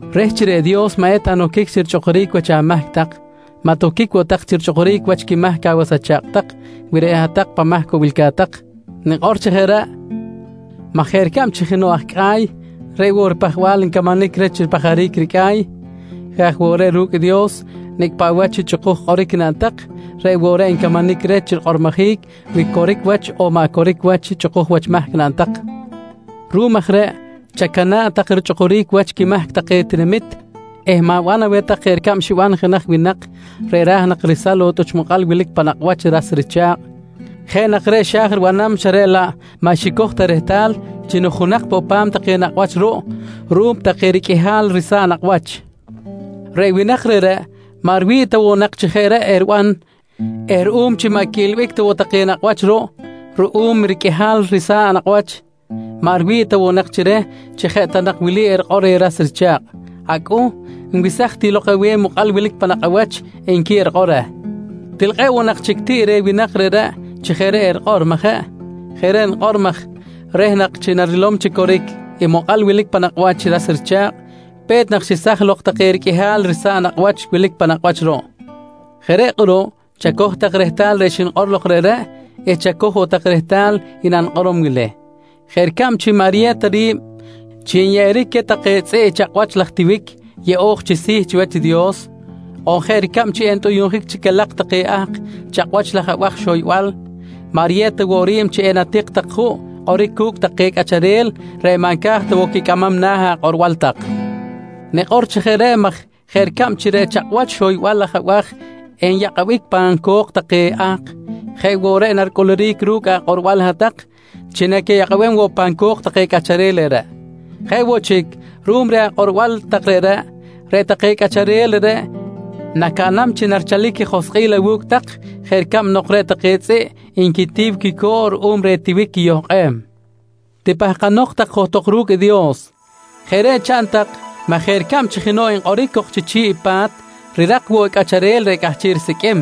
«Reh chi reꞌ Dios maꞌ eta noquic chi richꞌukuric wach amahc tak, maꞌ toquic woꞌ tak chi richꞌukuric wach quimahc awas acha̱kꞌ tak wi reꞌ hat-tak pan mahc woꞌ wilca̱t tak. Nikꞌor chi jeꞌ reꞌ maj jeꞌ ricab chi jenoꞌ aj cꞌa̱y reꞌ woꞌ i ripajbal ncamanic reh chi ripajaric i ricꞌa̱y, jeꞌ aj woꞌ reꞌ ru̱cꞌ i Dios nicꞌ paꞌ wach i chꞌukuj kꞌoric naꞌn tak, reꞌ woꞌ reꞌ ncamanic reh chi rikꞌormojic wi coric wach on maꞌ coric wach i chꞌukuj wach mahc naꞌn tak. Ruꞌum aj reꞌ, chacana̱ꞌ tak richꞌukuric wach quimahc take tinamit eh ma̱ban aweh jeꞌ ricab xiban jenaj winak reꞌ ra̱j nak resam lok i tꞌuch mokꞌal wilic pan nakꞌ wach i ras richa̱kꞌ. Jeꞌ nak reꞌ xa̱j ribanam xa reꞌ laꞌ maꞌ xicoj ta rehtal chi nujunak poꞌ pa̱m take nakꞌ wach ruꞌ ruꞌum take riqꞌuihal risa̱ꞌ nakꞌ wach. Reꞌ winak reꞌreꞌ, maꞌ riwi̱ꞌ ta nak chi jeꞌ reꞌ eriban eh ruꞌum chi maꞌ quiꞌilbic ta woꞌ take nakꞌ wach ruꞌ ruꞌum i riqꞌuihal risa̱ꞌ nakꞌ wach, maꞌ riwi̱ꞌ ta woꞌ chi reh chi jeꞌ ta nak wili erikꞌor reh ras richa̱kꞌ: ‹Acꞌuh, nwesaj ti lok aweh i mokꞌal wilic pan nakꞌ awach, nqui erikꞌor reh. «Til kꞌe̱ꞌ woꞌ nak chic tiꞌ reh winak reꞌreꞌ chi jeꞌ reꞌ erikꞌor, majeꞌ? Jeꞌ reꞌ nikꞌor maj reh nak chi narilom chi coric i mokꞌal wilic pan nakꞌ wach i ras richa̱kꞌ, pe̱t nak xesaj lok take riqꞌuihal risa̱ꞌ nakꞌ wach wilic pan nakꞌ wach ruꞌ. «Jeꞌ reꞌ kꞌuruꞌ chacoj tak rehtal reꞌ xnikꞌor lok reꞌreꞌ eh chacoj woꞌ tak rehtal i nanikꞌorom wili: Jeꞌ ricab chi maꞌ riyew ta ri̱b chi nyeꞌeric queh take tzꞌiꞌ i chakꞌwach laj tiwic yeꞌo̱j chi si̱ chiwach i Dios, on jeꞌ ricab chi entꞌuyuꞌnjic chi calak take ahk i chakꞌwach laj abaj xoybal, maꞌ riyew ta woꞌ ri̱b chi enatik tak juꞌ kꞌoric cu̱cꞌ take cꞌacharel reꞌ maꞌ nca̱j ta woꞌ quicꞌamam na̱ akꞌorbal tak. Nikꞌor chi jeꞌ reꞌ maj jeꞌ ricab chi reꞌ chakꞌwach xoybal laj abaj enyakꞌabic pan co̱k take ahk, jeꞌ woꞌ reꞌ naricꞌuluric ru̱cꞌ akꞌorbal hat-tak chi naquiyakꞌabem woꞌ pan co̱k take cꞌacharel reꞌreꞌ. Jeꞌ woꞌ chic, ruꞌum reh akꞌorbal tak reꞌreꞌ, reꞌ take cꞌacharel reꞌreꞌ nacaꞌnam chi narichalic quijoskꞌil awu̱cꞌ tak jeꞌ ricab nok reꞌ take tzꞌiꞌ nquitiw i quico̱ꞌ ruꞌum reh i tiwic quiyohkꞌem. «Tipahkanok tak johtok ru̱cꞌ i Dios. Jeꞌ reꞌ chaꞌn tak maj jeꞌ ricab chi jenoꞌ nkꞌoric cok chi chi̱ꞌ i pa̱t, rirak woꞌ i cꞌacharel reꞌ cꞌahchiꞌ risiqꞌuim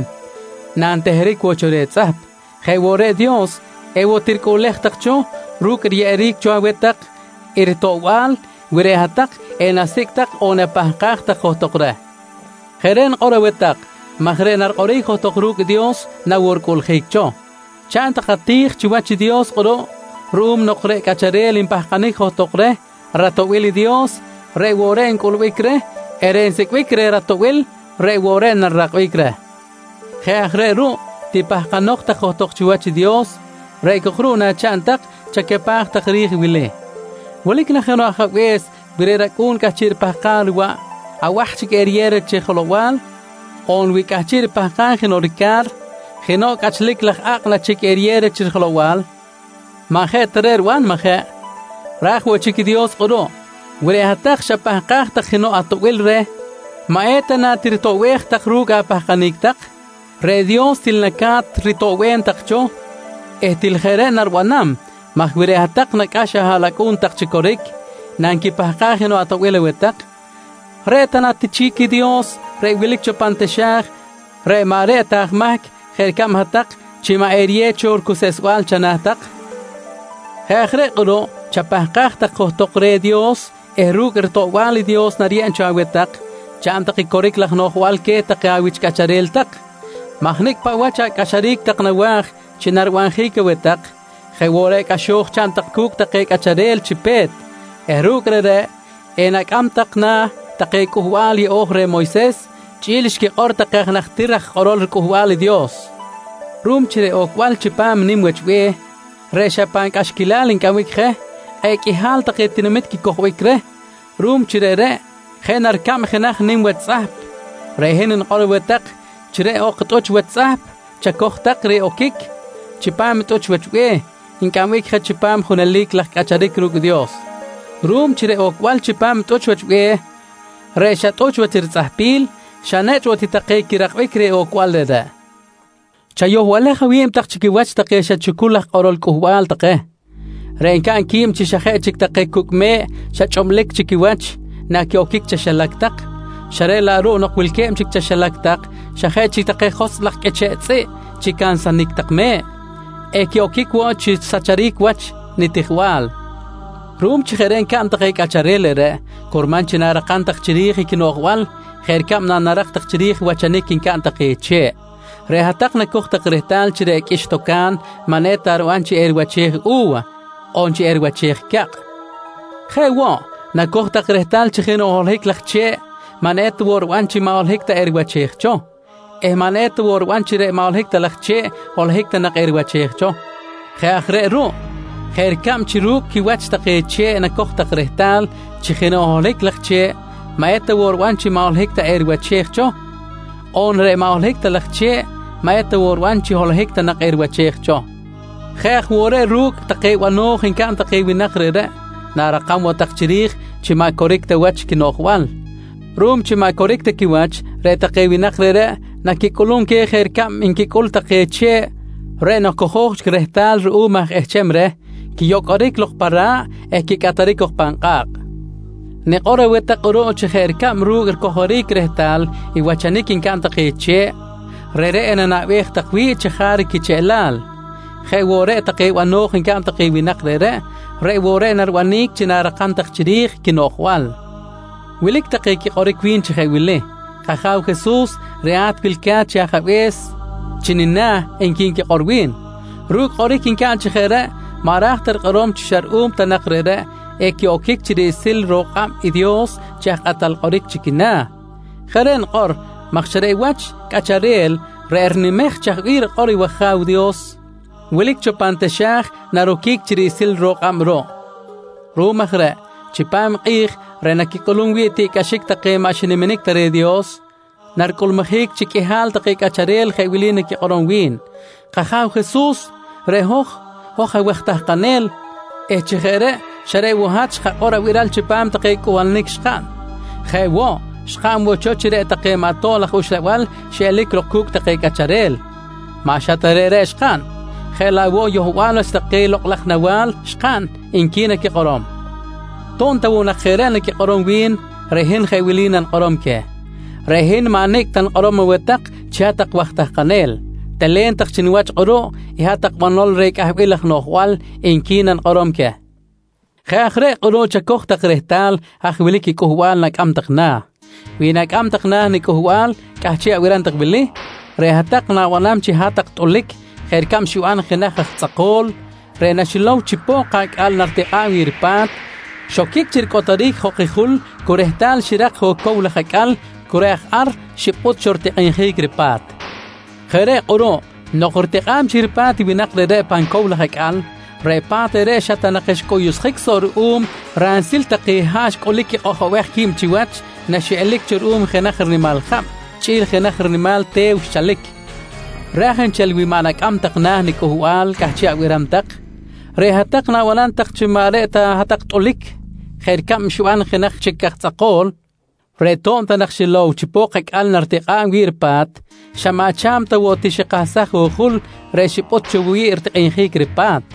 nanteheric cho reh i tzꞌahp, jeꞌ woꞌ reꞌ i Dios, ewoꞌ tiricꞌuꞌlej tak cho ru̱cꞌ riyeꞌeric cho aweh tak i ritoꞌbal wi reꞌ hat-tak enasicꞌ tak on enapahkaj tak johtok reh. Jeꞌ reꞌ nikꞌor aweh tak maj reꞌ narikꞌoric johtok ru̱cꞌ Dios na woꞌ ricꞌuꞌljic cho. Chaꞌn tak ati̱j chiwach i Dios kꞌuruꞌ ruꞌum nok reꞌ cꞌacharel npahkanic johtok reh ratoꞌbil i Dios, reꞌ woꞌ reꞌ ncꞌulbic reh eh reꞌ nsicꞌbic reh ratoꞌbil reꞌ woꞌ reꞌ narirakbic reh. Jeꞌ aj reꞌ ruꞌ tipahkanok tak johtok chiwach i Dios reꞌ cok ruꞌ nachaꞌn tak chacapaj tak chiri̱j i wili: Wilic na jenoꞌ ajabe̱s wi reꞌ racꞌu̱n cꞌahchiꞌ ripahkam riwaꞌ, abaj chic eriyew reh chi jelow-bal? On wi cꞌahchiꞌ ripahkam jenoꞌ rica̱r, jenoꞌ cꞌachlic laj a̱kꞌ na chic eriyew reh chi jelow-bal? Maꞌ jeꞌ ta reꞌ riban, majeꞌ? Ra̱j woꞌ chic i Dios kꞌuruꞌ, wi reꞌ hat-tak xapahkaj tak jenoꞌ atoꞌbil reh, maꞌ eta na tiritoꞌbej tak ru̱cꞌ apahkanic tak? Reꞌ Dios til laꞌ naca̱t ritoꞌbem tak cho eh til jeꞌ reꞌ naribanam maj wi reꞌ hat-tak nacꞌax ahaꞌlacꞌu̱n tak chi coric nanquipahkaj jenoꞌ atoꞌbil aweh tak, reꞌ ta na ti chic i Dios reꞌ wilic cho pan taxa̱j reꞌ maꞌ reꞌ ta aj mahc jeꞌ ricab hat-tak, chi maꞌ eriyew cho ricuseꞌsbal chana̱ tak? «Jeꞌ aj reꞌ kꞌuruꞌ chapahkaj tak johtok reh Dios eh ru̱cꞌ ritoꞌbal i Dios nariyeb cho aweh tak, chaꞌn tak i coric laj noꞌjbal queh take awich cꞌacharel tak maj nicꞌ paꞌ wach acꞌaxaric tak nawa̱j chi naribanjic aweh tak, jeꞌ woꞌ reꞌ cꞌaxo̱j chaꞌn tak cu̱cꞌ take cꞌacharel chi pe̱t eh ru̱cꞌ reꞌreꞌ enacꞌam tak na̱ take Cꞌuhbal Yeꞌo̱j reh Moyses chꞌi̱l xquikꞌor take aj najtir raj kꞌorol Cꞌuhbal i Dios. «Ruꞌum chi reꞌ ocbal chipam i nim wach i be̱h reꞌ xa pan cꞌaxquilal ncꞌambic je, kꞌe̱ꞌ qꞌuihal take tinamit quicojbic reh ruꞌum chi reꞌreꞌ jeꞌ na ricab jenaj nim wach tzꞌahp, reꞌ hin nikꞌor aweh tak chi reꞌ ok tꞌuch wach tzꞌahp chacoj tak chi oquic chipam i tꞌuch wach be̱h ncꞌambic je chipam junelic laj cꞌacharic ru̱cꞌ i Dios. Ruꞌum chi reꞌ ocbal chipam i tꞌuch wach be̱h reꞌ xa tꞌuch wach ritzꞌahpil, xa nechꞌ woꞌ ti take quirakbic reh ocbal reꞌreꞌ. «Chayohbalej awi̱b tak chi quiwach take xa chucul aj kꞌorol cꞌuhbal take, reꞌ ncaꞌn qui̱b chi xa jeꞌ chic take cucꞌ me̱ꞌ xa chꞌublic chic quiwach naquiꞌoquic chaxilac tak xa reꞌ laꞌ ruꞌ nok wilque̱b chic chaxilac tak, xa jeꞌ chic take joskꞌ laj qꞌuiche̱ꞌ tzꞌiꞌ chi cansanic tak me̱ꞌ, equiꞌoquic woꞌ chi risacharic wach nitijbal. Ruꞌum chi jeꞌ reꞌ ncaꞌn take cꞌacharel reꞌreꞌ, curman chi na̱rakam tak chiri̱j i quinoꞌjbal jeꞌ ricab nanarak tak chiri̱j i wachanic ncaꞌn take che̱ꞌ. Reꞌ hat-tak nacoj tak rehtal chi reꞌ qꞌuix-toca̱n maꞌ eta riban chi eriwachej cho u̱wa on chi eriwachej cakꞌ. Jeꞌ woꞌ, nacoj tak rehtal chi jenoꞌ holohic laj che̱ꞌ maꞌ eta woꞌ riban chi maꞌ holohic ta eriwachej cho eh maꞌ eta woꞌ riban chi reꞌ maꞌ holohic ta laj che̱ꞌ, holohic ta nak eriwachej cho. Jeꞌ aj reꞌ ruꞌ jeꞌ ricab chi ru̱cꞌ quiwach take che̱ꞌ nacoj tak rehtal chi jenoꞌ holohic laj che̱ꞌ maꞌ eta woꞌ riban chi maꞌ holohic ta eriwachej cho on reꞌ maꞌ holohic ta laj che̱ꞌ, maꞌ eta woꞌ riban chi holohic ta nak eriwachej cho, jeꞌ aj woꞌ reꞌ ru̱cꞌ take bano̱j ncaꞌn take winak reꞌreꞌ, na̱rakam woꞌ tak chiri̱j chi maꞌ coric ta wach quinoꞌjbal. Ruꞌum chi maꞌ coric ta quiwach, reꞌ take winak reꞌreꞌ naquicꞌulum queh jeꞌ ricab nquicꞌul take che̱ꞌ reꞌ nok cojo̱j chic rehtal ruꞌum aj ehcham reh, quiyocꞌoric lok pa ra̱ꞌ eh quicꞌataric cok pan kꞌa̱kꞌ. Nikꞌor aweh tak kꞌuruꞌ chi jeꞌ ricab ru̱cꞌ ricojoric rehtal i wachanic ncaꞌn take che̱ꞌ, reꞌreꞌ enanaꞌbej tak chajaric quicheꞌlal, jeꞌ woꞌ reꞌ take bano̱j ncaꞌn take winak reꞌreꞌ, reꞌ woꞌ reꞌ naribanic chi na̱rakam tak chiri̱j i quinoꞌjbal. «Wilic take quikꞌoric wi̱n chi jeꞌ wili: ‹K-Aja̱w Jesus reꞌ hat wilca̱t chi ajabe̱s chi nina̱, nqui nquikꞌor wi̱n. Ru̱cꞌ kꞌoric ncaꞌn chi jeꞌ reꞌ maꞌ ra̱j ta rikꞌorom chi xa ruꞌum ta nak reꞌreꞌ equiꞌoquic chi riꞌsil ro̱k kꞌab i Dios chi aj kꞌatal kꞌoric chi quina̱. Jeꞌ reꞌ nikꞌor maj xa reꞌ wach i cꞌacharel reꞌ rinimej chaj bih rikꞌor i wAja̱w Dios wilic cho pan taxa̱j naroquic chi riꞌsil ro̱k kꞌab ruꞌ. Ruꞌum aj reꞌ, chipam i kꞌi̱j reꞌ naquicꞌulum wi̱ꞌ tiꞌcꞌaxic take maꞌ xiniminic ta reh Dios, naricꞌulmujic chi qꞌuihal take cꞌacharel jeꞌ wili naquikꞌorom wi̱n: ‹K-Aja̱w Jesus, reꞌ hoj, hoj awaj tahkanel eh chi jeꞌ reꞌ xa reꞌ woꞌ hat xkakꞌor abiral chipam take cꞌuhbalanic xkaꞌn. Jeꞌ woꞌ, xkaꞌn woꞌ cho chi reꞌ take maꞌ tob laj uxlabal xiꞌelic lok cu̱cꞌ take cꞌacharel. Maꞌ xa ta reꞌ xkaꞌn, jeꞌ laꞌ woꞌ yohbal wach take lokꞌ laj nawa̱l xkaꞌn, nqui naquikꞌorom. «To̱b ta woꞌ jeꞌ reꞌ naquikꞌorom wi̱n, reꞌ hin jeꞌ wili nanikꞌorom queh: ‹Reꞌ hin maꞌ nicꞌ ta nikꞌorom aweh tak chi hat-tak waj tahkanel. Telen tak chi niwach kꞌuruꞌ i hat-tak banol reh cꞌahbil laj noꞌjbal, nqui nanikꞌorom queh. «Jeꞌ aj reꞌ kꞌuruꞌ chacoj tak rehtal haj wilic i cꞌuhbal na̱cꞌamam tak na̱. Wi na̱cꞌamam tak na̱ niCꞌuhbal cꞌahchiꞌ abiram tak wili, reꞌ hat-tak na̱banam tak chi hat-tak tꞌulic jeꞌ ricab xiban jenaj aj tzꞌako̱l, reꞌ naxilow chi pok-acꞌal naritikꞌa̱b wi̱ꞌ ripa̱t, xoquic chi ricꞌotoric jok i jul eh cu rehtal xirak jok i cow laj acꞌal cu reꞌ aj ar xipꞌut cho ritikꞌinjic ripa̱t. Jeꞌ reꞌ kꞌuruꞌ, nok ritikꞌa̱b chic ripa̱t i winak reꞌreꞌ pan cow laj acꞌal, reꞌ pa̱t reꞌreꞌ xa ta nak xcꞌuyuꞌsjic soꞌ ruꞌum ransil take haꞌ xcꞌulic quikꞌojobej qui̱b chiwach naxiꞌelic cho ruꞌum jenaj rinimal jab chꞌi̱l jenaj rinimal te̱w xchalic. «Ra̱j nchel wi maꞌ laꞌ na̱cꞌamam tak na̱ niCꞌuhbal cꞌahchiꞌ abiram tak, reꞌ hat-tak na̱banam tak chi maꞌ reꞌ ta hat-tak tꞌulic jeꞌ ricab xiban jenaj chic aj tzꞌako̱l, reꞌ to̱b ta nak xilow chi pok-acꞌal naritikꞌa̱b wi̱ꞌ ripa̱t, xa maꞌ cha̱m ta woꞌ ti xikahsaj i jul reꞌ xipꞌut cho wi̱ꞌ ritikꞌinjic ripa̱t.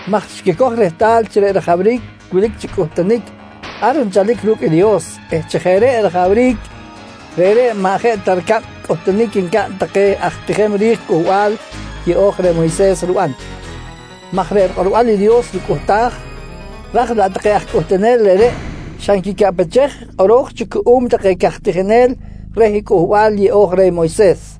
maj xquicoj rehtal chi reꞌ rajawric wilic chi cꞌuhtunic, ar nchalic ru̱cꞌ i Dios eh chi jeꞌ reꞌ rajawric, reꞌreꞌ maꞌ jeꞌ ta ricab i cꞌuhtunic ncaꞌn take aj tijem ri̱j Cꞌuhbal Yeꞌo̱j reh Moyses riban maj reꞌ rikꞌorbal i Dios ricꞌuhtaj, raj laꞌ take aj cꞌuhtunel reꞌreꞌ xa nquicaꞌpechej i kꞌoro̱j cho cuꞌum take caj tijinel reh i Cꞌuhbal Yeꞌo̱j reh Moyses.